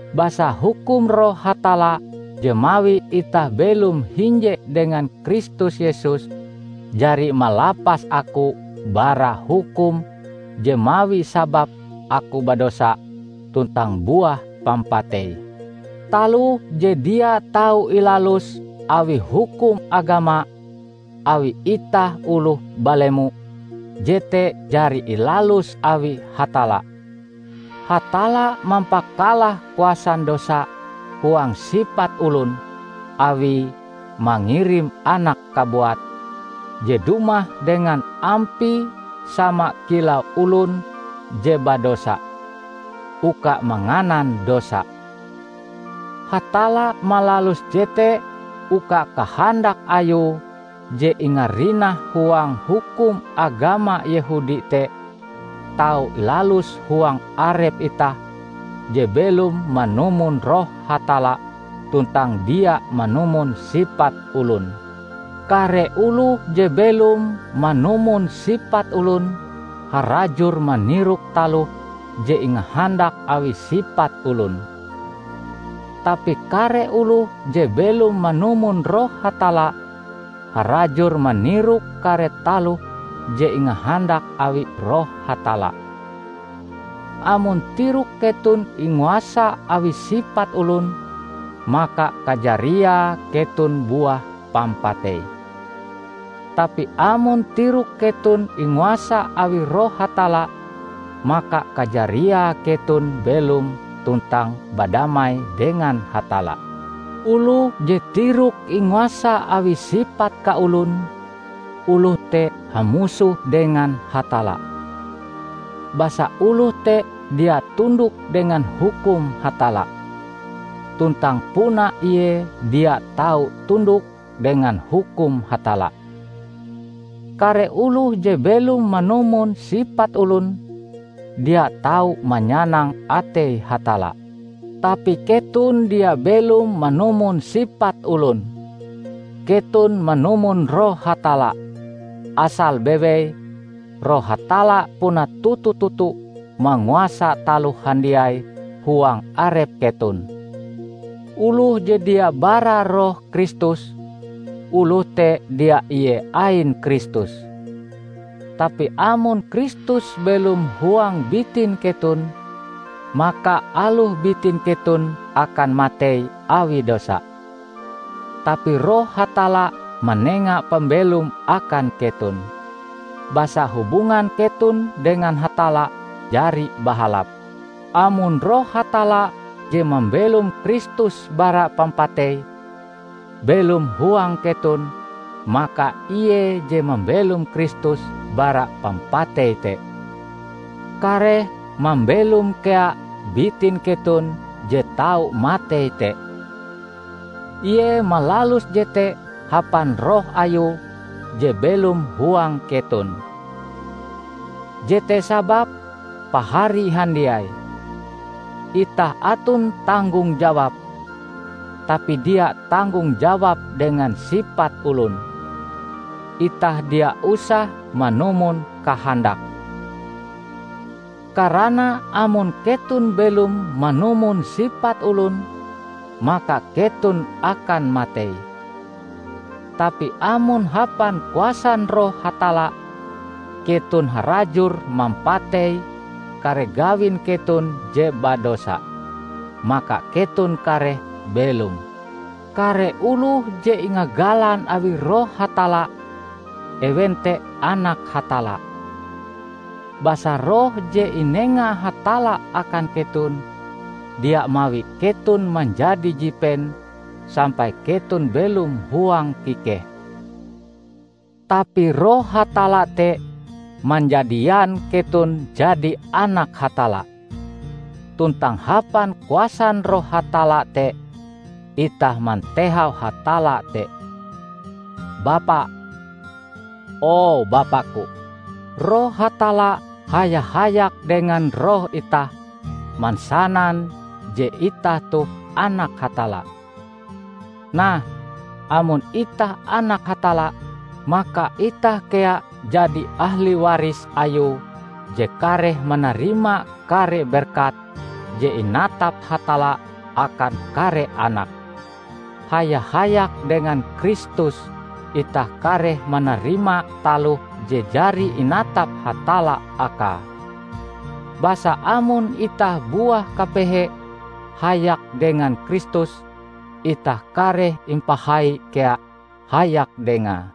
Basa hukum Roh Hatalla je mawi itah belom hinje dengan Kristus Yesus jari malapas aku bara hukum je mawi sabab aku badosa tuntang buah pampatei. Taloh je dia tau ilalus awi hukum agama, awi itah oloh balemo, jete jari ilalus awi Hatalla. Hatalla mampakalah kuasan dosa huang sipat olon awie mangirim Anake kabuat, je dumah dengan ampie sama kilau olon je badosa, uka manganan dosa. Hatalla malalus jete uka kahandak Ayue je ingarinah huang hukum agama Yehudi te tau ilalus huang arep itah je belom manumon Roh Hatalla tuntang dia manumon sipat olon. Kare oloh je belom manumon sipat olon, harajur manirok taloh je ingahandak awi sipat olon. Tapi kare oloh je belom manumon Roh Hatalla, harajur manirok kare taloh je ingahandak awi Roh Hatalla. Amon tirok keton inguasa awi sipat olon, maka kajariae keton buah pampatei. Tapi amon tirok keton inguasa awi Roh Hatalla, maka kajariae keton belom tuntang badamai dengan Hatalla. Oloh je tiroke inguasa awi sipat kaolon, oloh te hamusoh dengan Hatalla; basa oloh te dia tundok dengan hukum Hatalla; tuntang puna ie dia tau tundok dengan hukum Hatalla. Kare oloh je belom manumon sipat olon, dia tau manyanang atei Hatalla. Tapi keton dia belom manumon sipat olon. Keton manumon Roh Hatalla -- asal bewei, Roh Hatalla puna toto-toto manguasa taloh handiai huang arep keton. Oloh je dia bara Roh Kristus, oloh te dia ie ain Kristus. Tapi amon Kristus belom huang bitin keton, maka aloh bitin keton akan matei awi dosa, tapi Roh Hatalla manenga pambelom akan keton, basa hubungan keton dengan Hatalla jari bahalap. Amon Roh Hatalla, je mambelom Kristus bara pampatei, belom huang keton, maka ie je mambelom Kristus bara pampatei te, kareh mambelom kea bitin keton je tau matei te. Ie malalus jete hapan Roh Ayue je belom huang keton. Jete sababe pahari handiai, itah aton tanggong jawab; tapi dia tanggong jawab dengan sipat olon; itah dia usah manumon kahandake. Karana amon keton belom manumon sipat olon, maka keton akan matei; tapi amon hapan kuasan Roh Hatalla, keton harajur mampatei kare gawin keton je badosa, maka keton kareh belom. Kare oloh je ingagalan awi Roh Hatalla, ewen te anak Hatalla. Basa Roh je inenga Hatalla akan keton, dia mawi keton manjadi jipen sampai keton belom huang kikeh. Tapi Roh Hatalla te manjadian keton jadi anak Hatalla. Tuntang hapan kuasan Roh Hatalla te itah mantehau Hatalla te "Bapa, o Bapaku!" Roh Hatalla haya-hayak dengan roh itah mansanan je itah toh anak Hatalla. Nah, amon itah anak Hatalla maka itah kea jadi ahli waris Ayue je kareh manarima kare berkat je inatap Hatalla akan kare anake. Haya-hayak dengan Kristus itah kareh manarima taloh je jari inatap Hatalla akae; basa amon itah buah kapehe hayak dengan Kristus, itah kareh impahai kea hayak Dengae.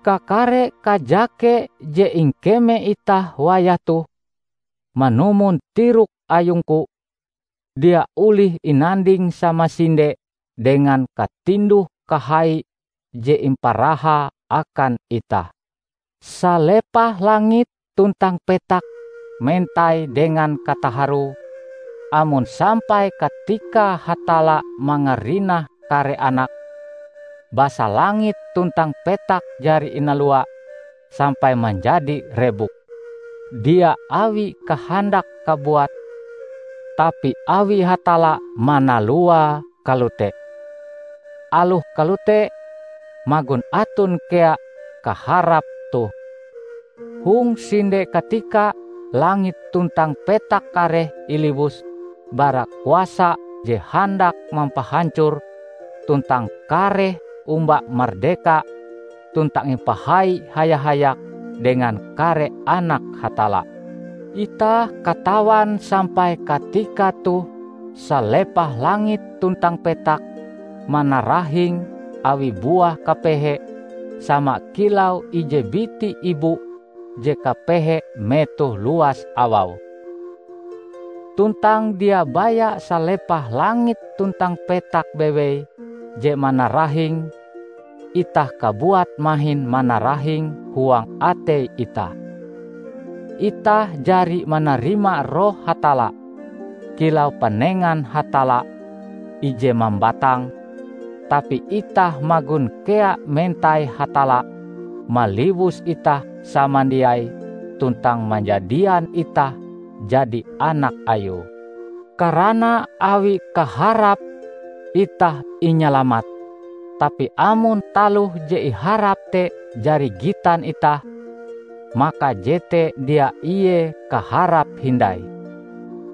Kakare kajake je ingkeme itah wayah toh, manumon tirok ayungku, dia olih inanding samasinde dengan katinduh-kahai je imparahae akan itah. Salepah langit tuntang petak mentai dengan kataharue amon sampai katikae Hatalla mangarinah kare anake. Basa langit tuntang petak jari inalua sampai manjadi rebuk, dia awi kahandake kabuat tapi awi Hatalla manaluae kalote. Aloh kalote, magon aton kea kaharap toh: hong sinde katika langit tuntang petak kareh iliwus bara kuasa je handak mampahancore tuntang kareh omba mardeka tuntang impahai haya-hayak dengan kare anak Hatalla. Itah katawan sampai katika toh salepah langit tuntang petak manarahing awi buah kapehe sama kilau ije biti ibu je kapehe metoh luas awau. Tuntang dia baya salepah langit tuntang petak bewei je manarahing; itah kabuat mahin manarahing huang atei itah. Itah jari manarima Roh Hatalla kilau panengan Hatalla ije mambatang, tapi itah magon kea mentai Hatalla maliwus itah samandiai tuntang manjadian itah jadi anak Ayue. Karana awi kaharap, itah inyalamat. Tapi amon taloh je iharap te jari gitan itah, maka jete dia ie kaharap hindai.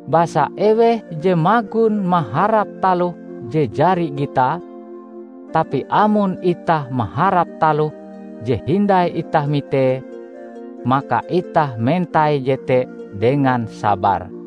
Basa eweh je magon maharap taloh je jari gitae? Tapi amon itah maharap taloh je hindai itah mitee, maka itah mentai jete dengan sabar.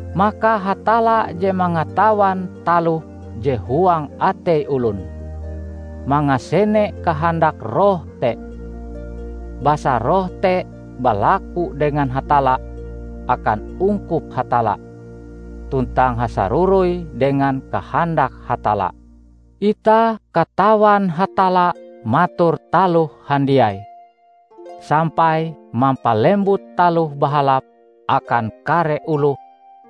Maka Hatalla je mangatawan taloh je huang atei olon, mangasene kahandak Roh te; basa Roh te balaku dengan Hatalla akan ungkup Hatalla, tuntang hasaroroi dengan kahandak Hatalla. Itah katawan Hatalla mator taloh handiai, sampai mampalembut taloh bahalap akan kare oloh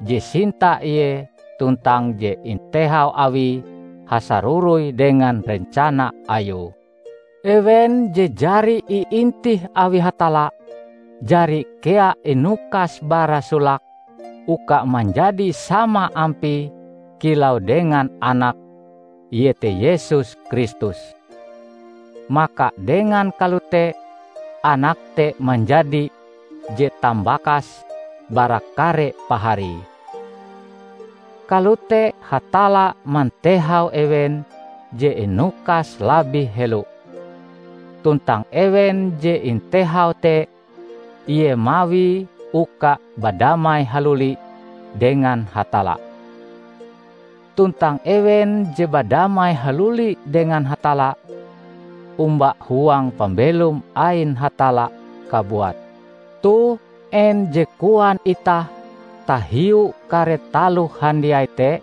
je sinta Ie tuntang je intehau Awie hasaroroi dengan rencana Ayue. Ewen je jari iintih awi Hatalla, jari kea inukas bara solake uka manjadi sama ampie kilau dengan Anake, iete Yesus Kristus. Maka dengan kalote anak te manjadi je Tambakase bara kare paharie. Kalote Hatalla mantehau ewen je inukase labih helo; tuntang ewen je intehau te, Ie mawie uka badamai haluli dengan Hatalla. Tuntang ewen je badamai haluli dengan Hatalla, omba huang pambelom ain Hatalla kabuat. Toh, en je koan itah tahiu kare taloh handiai te?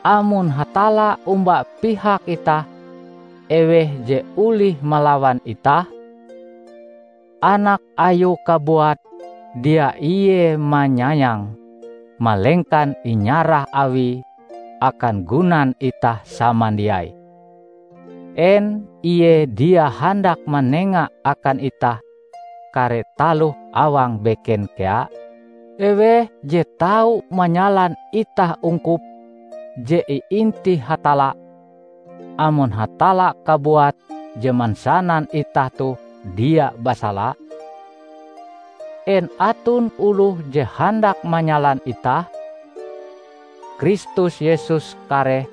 Amon Hatalla omba pihak itah, eweh je olih malawan itah? Anak Ayue kabuat dia Ie manyayange, malengkan inyarah Awie akan gunan itah samandiai; en Ie dia handak manenga akan itah kare taloh awang beken kea? Eweh je tau manyalan itah ungkup je iintih Hatalla, amon Hatalla kabuat je mansanan itah toh dia basala? En aton oloh je handak manyalan itah? Kristus Yesus kareh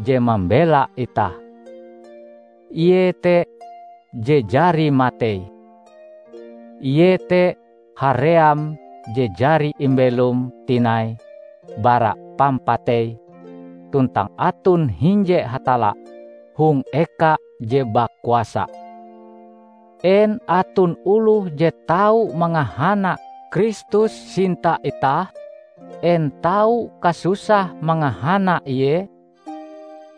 je mambela itah! Ie te je jari matei, ie te haream je jari imbelom tinai bara pampatei tuntang aton hinje Hatalla hong eka je bakuasa. En aton oloh je tau mangahana Kristus sinta itah? En tau kasusah mangahana Ie,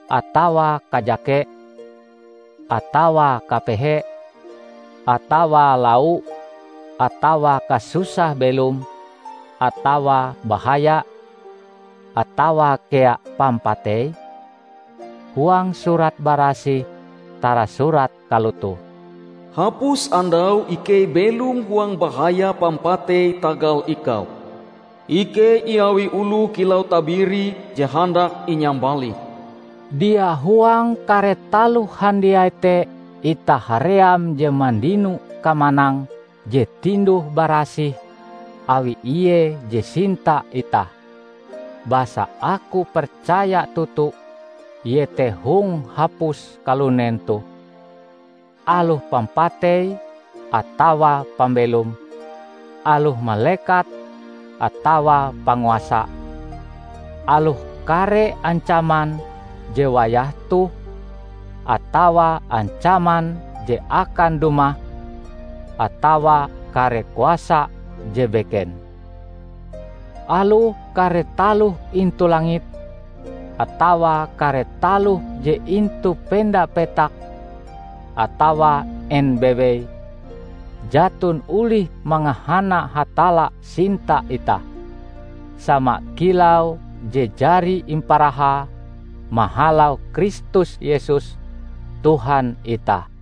atawa kajake, atawa kapehe, atawa lau, atawa kasusah belom, atawa bahaya, atawa kea pampatei? Huang Surat Barasih tarasurat kalotoh, "Hapus andau ikei belom huang bahaya pampatei tagal Ikau. Ikei iawi oloh kilau tabiri je handak inyambalih." Dia! Huang kare taloh handiai te itah haream je mandino kamanang je tinduh-barasih awi Ie je sinta itah! Basa aku percaya toto iete hong hapus kalunen toh, aloh pampatei atawa pambelom, aloh malekat atawa panguasa, aloh kare ancaman je wayah toh atawa ancaman je akan dumah atawa kare kuasa je beken; aloh kare taloh intu langit, atawa kare taloh je intu penda petak atawa en bewei, jaton olih mangahana Hatalla sinta itah, sama kilau je jari imparahae mahalau Kristus Yesus, Tuhan itah.